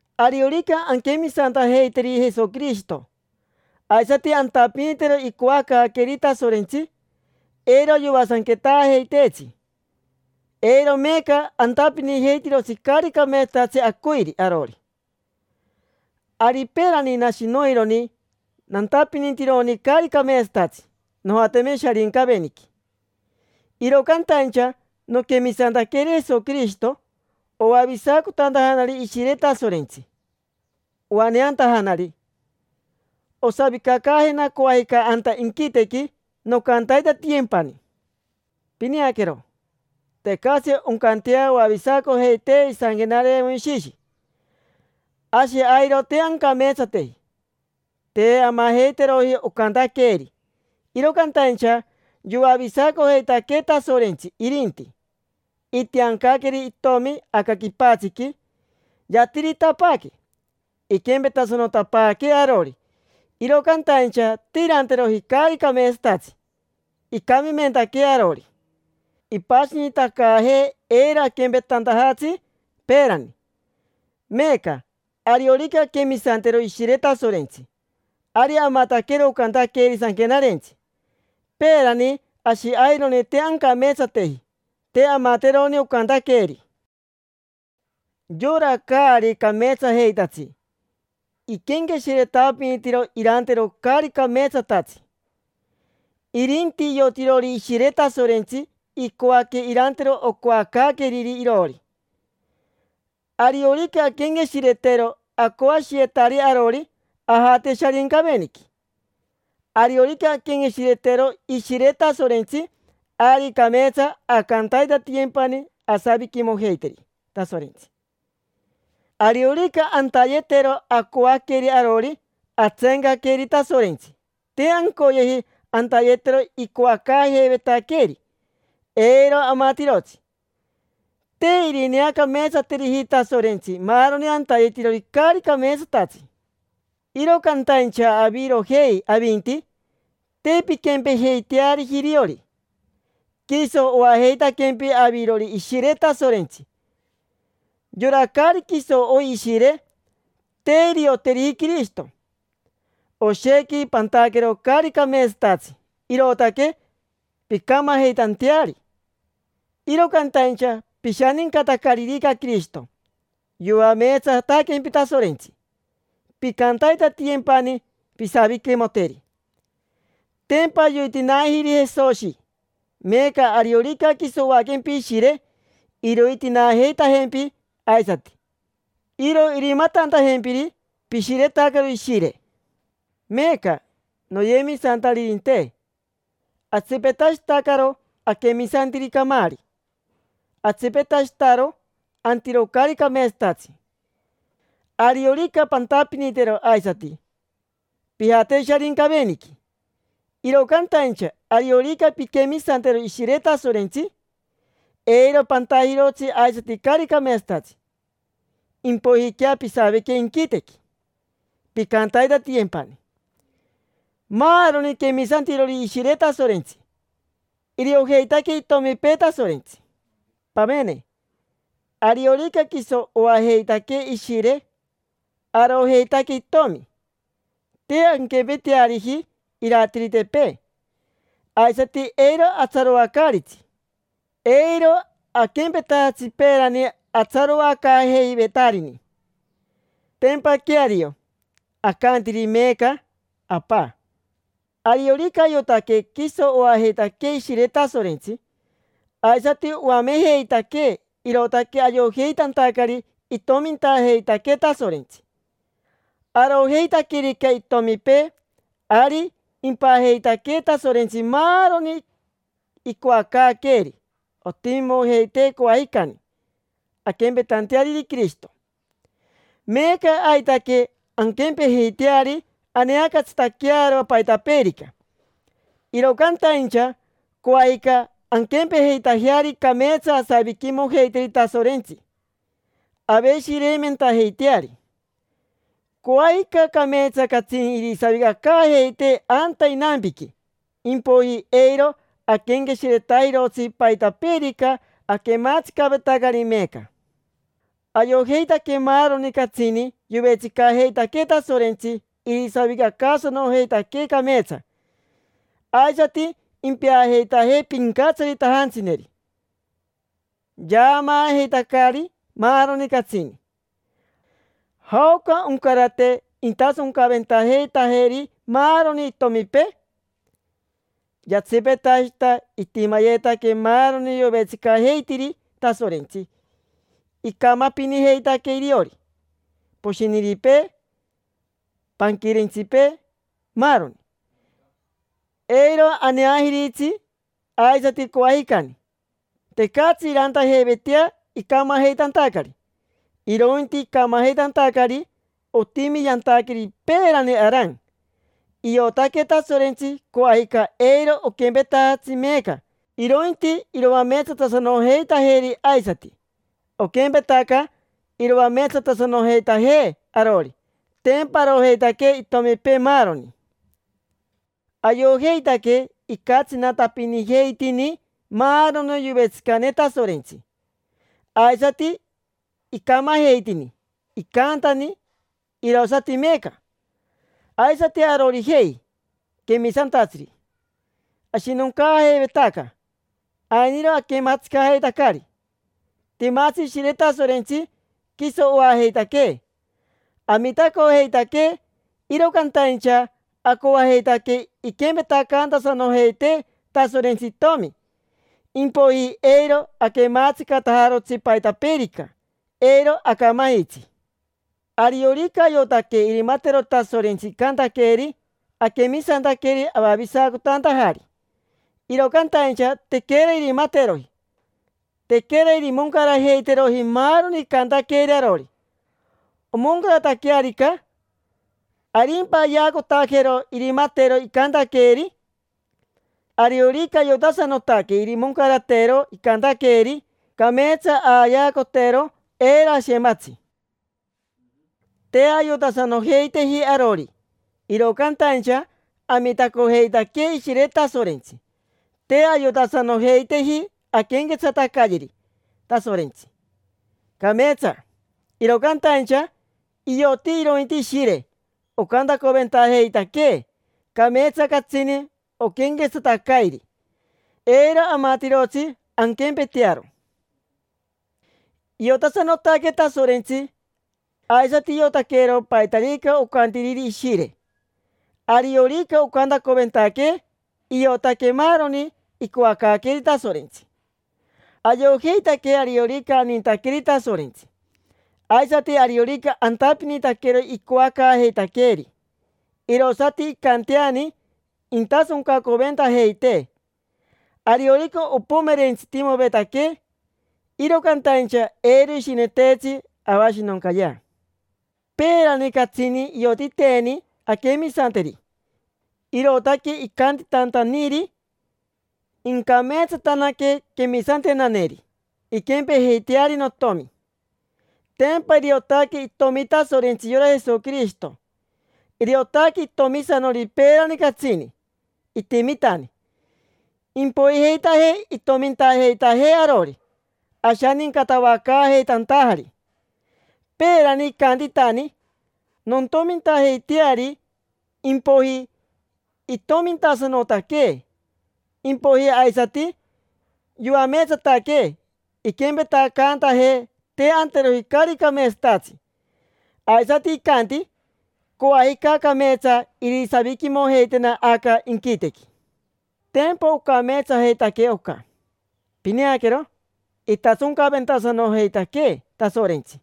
Ariorica anquemisantajeiteri Jesoquirishito, aisati antapinitero icoacaaqueeri Tasorentsi, eiro yoasanquetaajeiteetsi. Eiro meeca antapinijeitirotsi caari cameetsatatsi acoiri arori. Ari peerani nashi noironi nantapinitironi caari cameetsatatsi, nojateme Sharincaveniqui. Iro cantaincha noquemisantaqueri Jesoquirishito, oavisacotantajanari Ishire Tasorentsi, oaneantajanari. Osavicacaajena coajica anta inquitequi, noncantaitatiyempani. Pineaquero, tecatsi oncantea oavisacojeitee isanquenare Moishishi: ashi airo te ancameetsateji. Te amajeiteroji ocantaqueeri. Iro cantaincha yoavisacojeitaquee Tasorentsi, irinti. Itiancaqueri Itomi aca quipatsiqui, yatiritapaaque, iquempetasanotapaaquee arori, iro cantaincha te iranteroji caari cameetsatatsi. Icamimentaquee arori, ipashinitacaajee eiro aquempetantajatsi peerani. Meeca, ariorica anquemisantero Ishire Tasorentsi, ari amataquero ocantaqueeri Sanquenarentsi. Peerani ashi aironi te ancameetsateji, te amateroni ocantaqueeri. Yora caari cameetsajeitatsi iquenqueshiretapinitiro irantero caari cameetsatatsi. Irinti iotirori Ishire Tasorentsi icoaque irantero ocoacaaqueriri iroori. Ariorica anquenqueshiretero acoashiyetari arori, ajate Sharincaveniqui. Ariorica anquenqueshiretero Ishire Tasorentsi, ari cameetsa ancantaitatiyempani asaviquimojeiteri Tasorentsi. Ariorica antayetero acoaqueri arori, atseencaqueri Tasorentsi: te ancoyeji antayetero icoacaajeivetaqueeri. Eiro amatirotsi. Te irineacameetsateriji Tasorentsi maaroni antayetirori caari cameetsatatsi. Iro cantaincha avirojei avinti, te pinquempejeiteariji iriori. Quiso oajeitaquempi avirori Ishire Tasorentsi. Yora caari quiso oi Ishire, te irioteriji Quirishito. Oshequi pantaquero caari cameetsatatsi, irootaque pincamajeitanteari, iro cantaincha pishanincatacaririca Quirishito, yoameetsataquempi Tasorentsi, pincantaitatiyempani pisaviquimoteri. Tempa yoitinaajiri Jesoshi. Meeca ariorica quiso oaquempi Ishire, irointinaajeitajempi aisati, iroaneajeitajempi aisati. Iro irimatantajempiri pishiretacaro Ishire. Meeca, noyemisantaririnte, atsipetashitacaro aquemisantiri camaari, atsipetashitaro antiro caari cameetsatatsi. Ariorica pantapinitero aisati, pijate Sharincaveniqui. Iro cantaincha ariorica pinquemisantero Ishire Tasorentsi, eiro pantajirotsi aisati caari cameetsatatsi, impoijiquea pisavique inquitequi, pincantaitatiyempani. Maaroni quemisantirori Ishire Tasorentsi, iriojeitaque itomipee Tasorentsi. Pamene, ariorica quiso oajeitaquee Ishire, arojeitaque Itomi. Te anquempeteariji iratiritepee, aisati eiro atsaroacaaritsi. Eiro aquempetajatsi peerani atsaroacaajeivetarini. Tempa queario, acantiri meeca: “Apa”. Ariorica ayotaque quiso oajeitaquee Ishire Tasorentsi, aisati oamejeitaquee, irootaque ayojeitantacari itomintajeitaquee Tasorentsi. Arojeitaquerica itomipee, ari impajeitaquee Tasorentsi maaroni icoacaaqueeri ontimimojeitee coajicani, anquempejeiteari Quirishito. Meeca aitaque anquempejeiteari aneacatsitaquearo paitapeerica, iro cantaincha coajica anquempejeitajeari cameetsa asaviquimojeiteri Tasorentsi, aveshireimentajeiteari. Coajica cameetsa catsini irisavicacaajeitee anta inampiqui, impoiji eiro aquenqueshiretajirotsi paitapeerica aquematsicavetacari meeca. Ayojeitaque maaroni catsini yovetsicajeitaquee Tasorentsi irisavicacaasanojeitaquee cameetsa, aisati impeajeitajee pincatsaritajantsineri. Yaamaajeitacari maaroni catsini: “¿Jaoca oncarate intasoncaventajeitajeri maaroni itomipee?” Yatsipetashita itimayetaque maaroni yovetsicajeitiri Tasorentsi: icamapinijeitaque iriori poshiniripee, panquirentsipee, maaroni; eiro aneajiritsi aisati coajicani. Tecatsi irantajeivetea icamajeitantacari, irointi icamajeitantacari otimi yantaqueri peerani Aran. Iotaque Tasorentsi coajica eiro oquempetajatsi meeca, irointi iroameetsatasanojeitajeri aisati, oquempetaca iroameetsatasanojeitajee arori: tempa arojeitaque itomipee maaroni. Ayojeitaque icatsinatapinijeitini maaroni yovetsicane Tasorentsi, aisati icamajeitini: icantani, irosati meeca. Aisati arorijei quemisantatsiri, ashinoncaajeivetaca, ainiro aquemaatsicajeitacari. Timatsi Ishire Tasorentsi, quiso oajeitaquee, amitacojeitaquee; iro cantaincha acoajeitaque inquempetacaantasanojeitee Tasorentsi itomi. Impoiji eiro aquematsicatajarotsi paitapeerica, eiro acamajitsi. Ariorica ayotaque irimatero Tasorentsi icantaqueeri, aquemisantaqueri avavisacotantajari. Iro cantaincha tequera irimateroji, tequera irimoncarajeiteroji maaroni icantaqueeri arori. Omoncarataquearica, ¿arimpa ayeacotajero irimateero icantaqueeri? Ariorica ayotasanotaque irimoncarateero icantaqueeri, cameetsa ayeacotero, eiro ashematsi. Te ayotasanojeiteji arori, iro cantaincha amitacojeitaquee Ishire Tasorentsi. Te ayotasanojeiteji anquenquetsatacayeri Tasorentsi cameetsa, iro cantaincha ioti irointi Ishire, ocantacoventajeitaquee; cameetsa catsini oquenquetsatacairi, eiro amatirotsi anquempetearo. Iotasanotaquee Tasorentsi, aisati iotaquero paitarica ocantiriri Ishire. Ariorica ocantacoventaquee, iotaque maaroni icoacaaqueeri Tasorentsi. Ayojeitaque ariorica anintaqueri Tasorentsi, aisati ariorica antapinitaquero icoacaajeitaqueeri, irosati incanteani intasoncacoventajeitee. Ariorica ompomerentsitimovetaquee, iro cantaincha eiro ishineteetsi avashinoncayea. Peerani catsini iotiteeni anquemisanteri, irootaque icantitantaniri: “Incameetsatanaque quemisantenaneri, inquempejeiteari Notomi”. Tempa iriotaque Itomi Tasorentsi yora Jesoquirishito. Iriotaque itomisanori peerani catsini, itimitani; impoijeitajee itomintajeitajee arori, ashanincatavacaajeitantajari. Peerani icantitani: “Nontomintajeiteari”, impoiji itomintasanotaquee; impoiji aisati yoameetsataquee, iquempetacaantajee te anteroji caari cameetsatatsi. Aisati icanti: “Coajica cameetsa irisaviquimojeitena aca inquitequi”. Tempa ocameetsajeitaque oca. Pineaquero, itasoncaventasanojeitaquee Tasorentsi: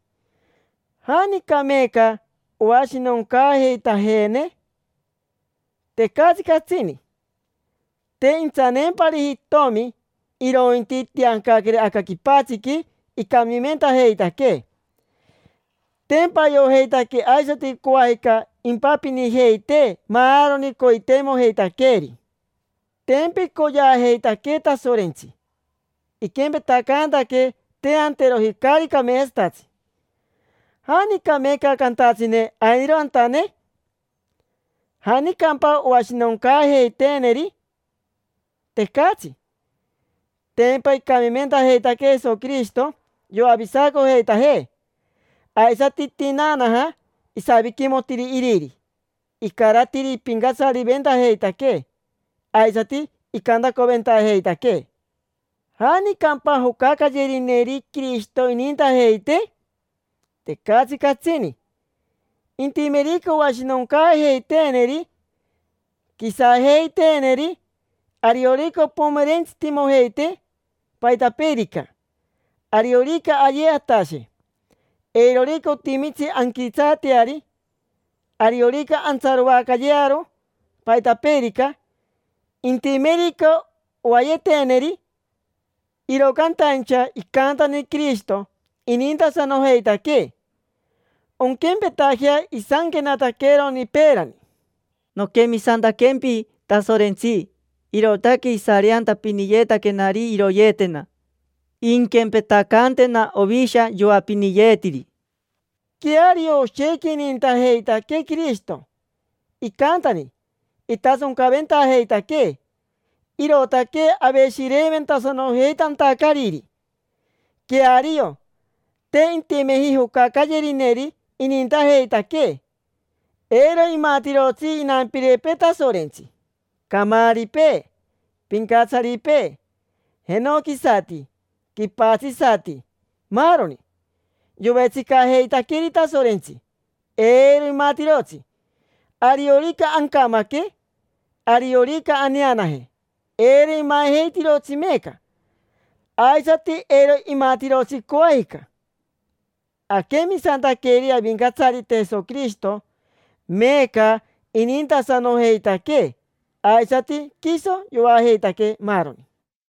¿janica meeca oashinoncaajeitajeene? Tecatsi catsini. Te intsaneempariji Itomi, irointi itiancaqueri aca quipatsiqui icamimentajeitaquee. Tempa ayojeitaque aisati coajica impapinijeitee maaroni coiteimojeitaqueeri. Tempa icoyeajeitaquee Tasorentsi, iquempetacaantaquee te anteroji caari cameetsatatsi: ¿janica meeca cantatsine ainiro antane? ¿Janicampa oashinoncaajeiteeneri? Tecatsi: tempa icamimentajeitaquee Jesoquirishito yoavisacojeitajee. Aisati itinaanaja, isaviquimotiri Iriri, icaratiri ipincatsariventajeitaquee, aisati icantacoventajeitaquee. ¿Janicampa jocacayerineri Quirishito inintajeitee? Tecatsi catsini. Intimerica oashinoncaajeiteeneri, quisajeiteeneri; ariorica ompomerentsitimojeitee paitapeerica, ariorica ayee atashe, eirorica otimitsi anquitsaateari, ariorica antsaroacayearo paitapeerica, intimerica oayeteeneri; iro cantaincha icantani Quirishito, inintasanojeitaquee. Onquempetajea isanquenataqueroni peerani: “Noquemisantaquempi, Tasorentsi, irootaque isareantapiniyeetaquenari iroyeetena. Inquempetacaantena ovisha yoapiniyetiri”. Queario oshequi inintajeitaquee Quirishito, icantani: itasoncaventajeitaquee, irootaque aveshireimentasanojeitantacariri. Queario, te intimeji jocacayerineri inintajeitaquee: eiro imatirotsi inampirepee Tasorentsi, camaaripee, pincatsaripee, jenoquisati, quipatsisati, maaroni yovetsicajeitaqueri Tasorentsi, eiro imatirotsi. Ariorica ancamaque, ariorica aneanaje, eiro imajeitirotsi meeca, aisati eiro imatirotsi coajica. Aquemisantaqueri Avincatsarite Jesoquirishito, meeca inintasanojeitaquee, aisati quiso yoajeitaquee maaroni.